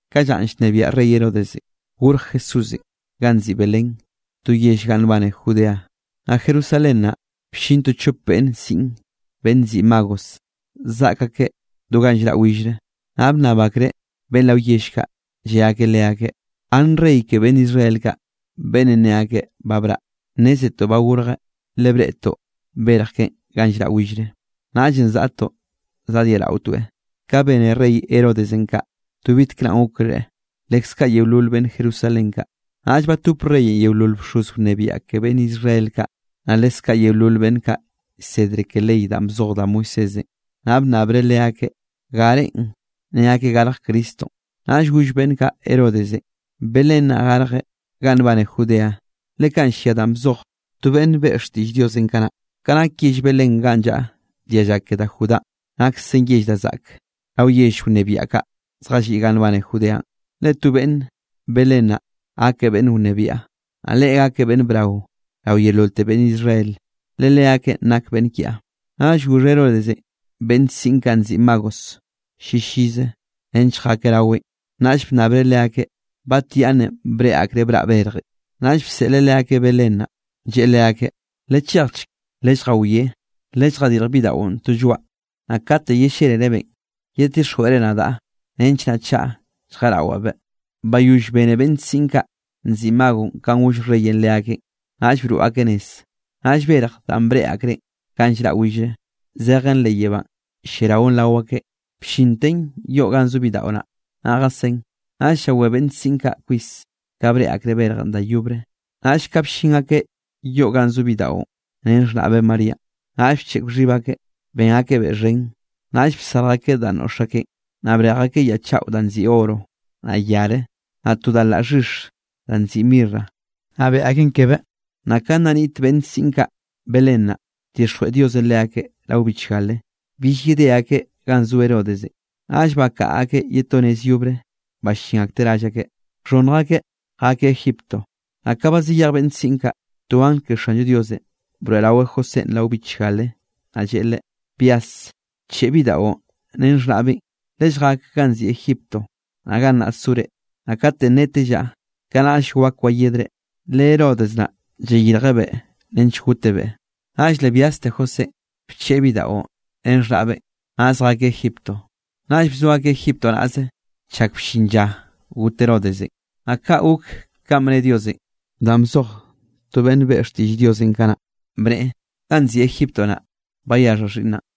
Ka llanꞌ llnebiaꞌ rey Herodes, gorj Jesúsenꞌ ganꞌ nziꞌi Belén, to yell ganꞌ nbane Judea. Naꞌ Jerusalén naꞌ bllin to chop beꞌnn siꞌn beꞌnn nziꞌi magos, zaꞌk akeꞌ do ganꞌ llraꞌ willre. Naꞌ bnnab akreꞌ beꞌnn rao yell kaꞌ, lle akeꞌ leakeꞌ: —¿Gann rey ke beꞌnn Israel kaꞌ, beꞌnnenꞌ ne akeꞌ ba braꞌ? Nnézetoꞌ ba gorjeꞌ, le breꞌtoꞌ berj keꞌen ganꞌ llraꞌ willre, naꞌllenꞌ zaꞌtoꞌ zadyeꞌraotoeꞌ. Ka bene rey Herodesenꞌ kaꞌ, to bitkraꞌn gokreꞌ, leskaꞌ yeolol beꞌnn Jerusalén kaꞌ. Naꞌll batop reyenꞌ yeolol bxoz wnebiaꞌ ke beꞌnn Israel kaꞌ, naꞌ leskaꞌ yeolol beꞌnn kaꞌ llsedre ke ley danꞌ bzoj da Moisésenꞌ. Naꞌ bnnabreꞌ leakeꞌ, garenꞌ ne akeꞌ garj Cristonꞌ. Naꞌll goll beꞌnn kaꞌ Herodesenꞌ: —Belén naꞌ garjeꞌ ganꞌ nbane Judea, le kaꞌn llia danꞌ bzoj to beꞌnn beꞌe xtiꞌll Diosenꞌ kanaꞌ: Ka nak yell Belén ganꞌ llaꞌa dialla ke da Judánꞌ, naksen yell da zaꞌke rao yell wnebiaꞌ kaꞌ zjalliꞌ ganꞌ nbane Judeanꞌ. Le to beꞌnn Belén naꞌ gakeꞌ beꞌnn wnebiaꞌ, naꞌ Leꞌe gakeꞌ beꞌnn braonꞌ rao yeololte beꞌnn Israel, le leakeꞌn nak beꞌnn kiaꞌ. Naꞌll goxh Herodesenꞌ beꞌnn siꞌn kaꞌ nziꞌi magos llillize nench jakeꞌ raweꞌn, naꞌll bnnabreꞌ leakeꞌ batyaꞌnnenꞌ breꞌe akreꞌ braꞌ berjenꞌ. Naꞌll bseꞌleꞌ leakeꞌ Belén naꞌ, lleꞌe leakeꞌ: —Lechejchk, lelljawiá, lelljadirj bidaꞌon to lloaꞌ. Naꞌ kate yellélerebeꞌn, yeddixjweꞌre nadaꞌ, nench naꞌ chaꞌa lljeꞌrawabeꞌ. Bayoll bene beꞌnn siꞌn kaꞌ nziꞌi magos kanꞌ goll reyenꞌ leakeꞌn, naꞌll broꞌ akeꞌ nez. Naꞌll berj danꞌ breꞌe akreꞌ ganꞌ llraꞌ willenꞌ, zejen leꞌ yebánꞌ lliaraon rao akeꞌn, bllinten yoꞌ ganꞌ zo bidaꞌo naꞌ, naꞌ jasén. Naꞌll llawé beꞌnn siꞌn kaꞌ kwis ka breꞌe akreꞌ berjenꞌ da yobre. Naꞌll ka bllin akeꞌ yoꞌ ganꞌ zo bidaꞌon ren xhnaꞌbeꞌ Maríanꞌ, naꞌll bcheꞌk xhib akeꞌ, ben akebeꞌ xhen. Naꞌll bsarj akeꞌ danꞌ noꞌx akeꞌn, naꞌ brej akeꞌ ya chaꞌo danꞌ nziꞌi oro, naꞌ yare, naꞌ to da laꞌ xhix da nziꞌi mirra, naꞌ beꞌe akeꞌn kebeꞌ. Naꞌ ka nna niꞌt beꞌnn siꞌn kaꞌ Belén naꞌ, bdixjweꞌ Diosenꞌ leakeꞌ rao bichgale, bill yedé akeꞌ ganꞌ zo Herodesenꞌ. Naꞌll bakaꞌa akeꞌ ye to nez yobre, ballín akteꞌ rall akeꞌ. Naꞌ ka ba zayej beꞌnn siꞌn kaꞌ, to angl ke Xanllo Dios broeꞌraweꞌ Josénꞌ rao bichgale, naꞌ lleꞌe leꞌe: —Byas, bcheꞌe bidaꞌon ren xhnaꞌbeꞌn, lelljak ganꞌ nziꞌi Egipto, naꞌ gannaꞌ sore, naꞌ kate netellaꞌ, kanaꞌll wak wayedre, le Herodes naꞌ llayirjebeꞌ nench gotebeꞌ. Naꞌll le byaste Josénꞌ, bcheꞌe bidaꞌon ren xhnaꞌbeꞌ, naꞌ zjakeꞌ Egiptonꞌ. Naꞌll bzo akeꞌ Egipto naꞌze chak bllin lla got Herodesenꞌ, naꞌ kaꞌ gok kanꞌ bne Diosenꞌ danꞌ bzoj to beꞌnn beꞌe xtiꞌll Diosenꞌ kanaꞌ, bneꞌe: “Ganꞌ nziꞌi Egipto naꞌ, bayaxhaꞌ xhiꞌnnaꞌn.”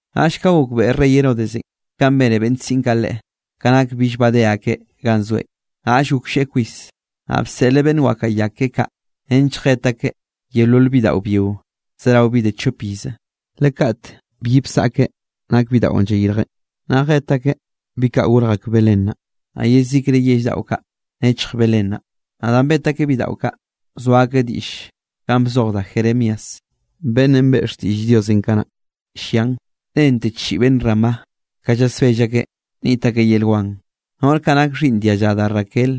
Naꞌll ka gokbeꞌe rey Herodes kanꞌ bene beꞌnn siꞌn kaꞌ leꞌe, ka nak bill badé akeꞌ ganꞌ zoeꞌn, naꞌll goklleꞌe kwis. Naꞌ bseꞌleꞌ beꞌnn wakaꞌa ya keꞌe kaꞌ nench jet akeꞌ yeolol bidaꞌo byio zerao bi de chop ize, le kaꞌt byi bsaꞌke nak bidaꞌon llayirjeꞌ. Naꞌ jet akeꞌ bi kaꞌ gorj ak Belén naꞌ, naꞌ yezikre yell daꞌo kaꞌ nechj Belén naꞌ. Naꞌ danꞌ bet akeꞌ bidaꞌo kaꞌ, bzoa diꞌll kanꞌ bzoj da Jeremías, beꞌnnenꞌ beꞌe xtiꞌll Diosenꞌ kanaꞌ llian: Nente chiꞌi beꞌnn Ramá, ka llasbell akeꞌ niꞌt akeꞌ yel wan. Noꞌr kaꞌ nake xhiꞌnn dialla da Raquel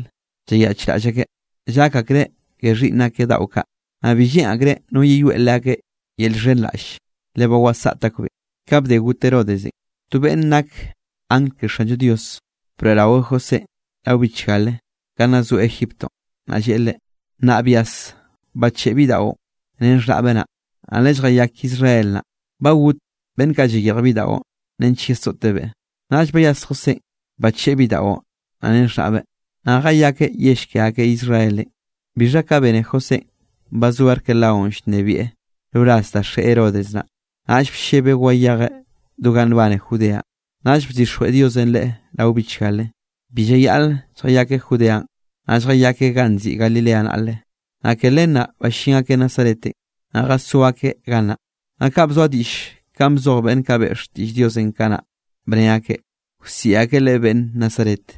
llayaꞌchraꞌll akeꞌ, llak akreꞌ ke xhiꞌnn akeꞌ daꞌo kaꞌ, naꞌ bi lleꞌn akreꞌ no yeyoeꞌ leakeꞌ yel llxhenraꞌlle, le ba wasaꞌt akbeꞌn. Ka bde got Herodesenꞌ, to beꞌnn nak angl ke Xanllo Dios broeꞌraweꞌ Josénꞌ rao bichgale ka nna zoeꞌ Egiptonꞌ, naꞌ lleꞌe leꞌe: —Nnaꞌ byas bacheꞌe bidaꞌon ren xhnaꞌbeꞌ naꞌ, naꞌ lelljayak Israel naꞌ. Ba got beꞌnn kaꞌ llayirj bidaꞌon nench yesoꞌtebeꞌ. Naꞌll bayas Josénꞌ, bacheꞌe bidaꞌon naꞌ ren xhnaꞌbeꞌ, naꞌ jayakeꞌ yell ke akeꞌ Israelenꞌ. Bixha ka bene Josénꞌ ba zo Arquelaonꞌ llnebieꞌ roraz da xeꞌe Herodes naꞌ, naꞌll bllebeꞌ wayejeꞌ do ganꞌ nbane Judea. Naꞌll bdixjweꞌ Diosenꞌ leꞌe rao bichgale, bi llayaꞌleꞌ lljayakeꞌ Judeanꞌ, naꞌ lljayakeꞌ ganꞌ nziꞌi Galilea naꞌle. Naꞌ ke len naꞌ ballín akeꞌ Nazaretenꞌ, naꞌ jazó akeꞌ gannaꞌ. Naꞌ kaꞌ bzoa diꞌll kanꞌ bzoj beꞌnn kaꞌ beꞌe xtiꞌll Diosenꞌ kanaꞌ, bne akeꞌ: “Wsiꞌi akeꞌ Leꞌe beꞌnn Nazaret.”